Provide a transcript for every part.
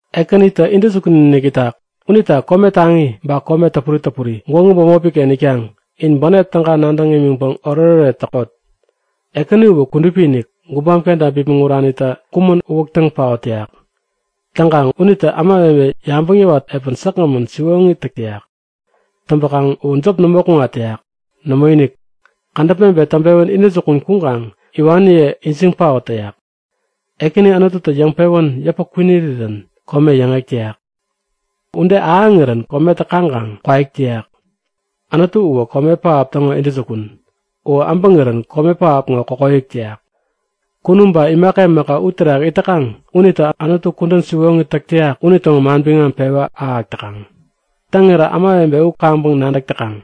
Ekänitä intäjukun-inik itak. Unita kome taŋi, ba kome täpuri täpuri gwägu bämopiken itkaŋ, in bänep täga nadäŋ imiŋpäŋ oretoret täkot. Ekäni uwä kudupi-inik. Gubam kenta bipmäŋ uranitä kumän uwäk täŋ paot täyak. Täŋkaŋ unitä ämawebe yabäŋ yäwat epän säkgämän siwoŋi täk täyak. Täŋpäkaŋ uwä jop nämo kuŋat täyak. Nämoinik, kädäp mebet täŋpewän intäjukun kuŋkaŋ iwaniye ijiŋ paot täyak. Ekäni Anututä yäŋpewän yäpä kwinirirän kome yäŋek täyak. Ude ahäŋirän kometä kaŋkaŋ kwaik täyak. Anutu uwä kome pähap täŋo intäjukun. U äbäŋirän kome pähap ŋo kokoyäk täyak. Kunum ba imaka imaka u terak it täkaŋ unitä Anutu kudän siwoŋi täk täyak unitäŋo manbiŋam pewä ahäk täkaŋ. Täŋirä ämawebe u kaŋpäŋ nadäk täkaŋ.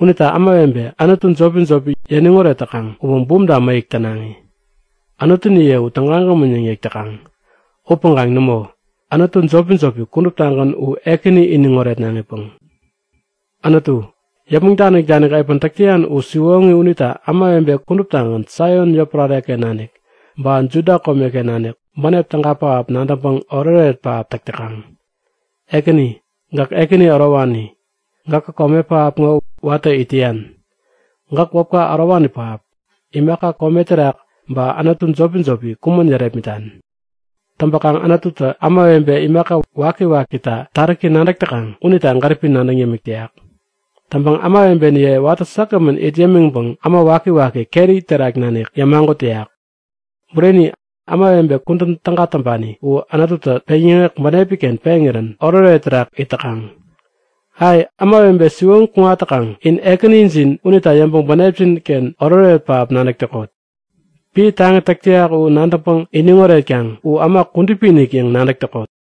Unita ämawebe anutu jopi-jopi yäniŋ oret täkaŋ uwä bumta mäyäk tänaŋi. Anutuniye u tägagämän yäŋ yäk täkaŋ. Upäŋkaŋ nämo! Anutu jopi-jopi kuduptagän u Ekäni iniŋ oretnaŋipäŋ. Anutu, yäpmäŋ danik-danik epän täk täyan u siwoŋi unita ämawebe kuduptagän Saion yotpärareken nanik ba Juda komeken nanik bänep täga pähap nadäŋpäŋ oretoret pähap täk täkaŋ. Ekäni, gäk ekäni ärowani. Gäkä kome pähap ŋo watä it täyan. Gäk wäpka ärowani pähap. Imaka kome terak ba anutu jopi-jopi kumän yärepmitan. Täŋpäkaŋ Anututä ämawebe imaka waki-wakita taräki nadäk täkaŋ unita gäripi nadäŋ yämik täyak. Täŋpäŋ ämawebeniye watä säkgämän it yämiŋpäŋ äma wakiwaki keri terak nanik yämagut täyak. Bureni, ämawebe kudän täga täŋpani u Anututä peŋyäŋek bänepiken peŋirän oretoret terak it täkaŋ. Ai! Ämawebe siwoŋi kuŋat täkaŋ, in Ekänijin unita yäŋpäŋ bänepjinken oretoret pähap nadäk täkot! Piä taŋi täk täyak u nadäŋpäŋ iniŋ oretkaŋ U äma kudupi-inik yäŋ nadäk täkot!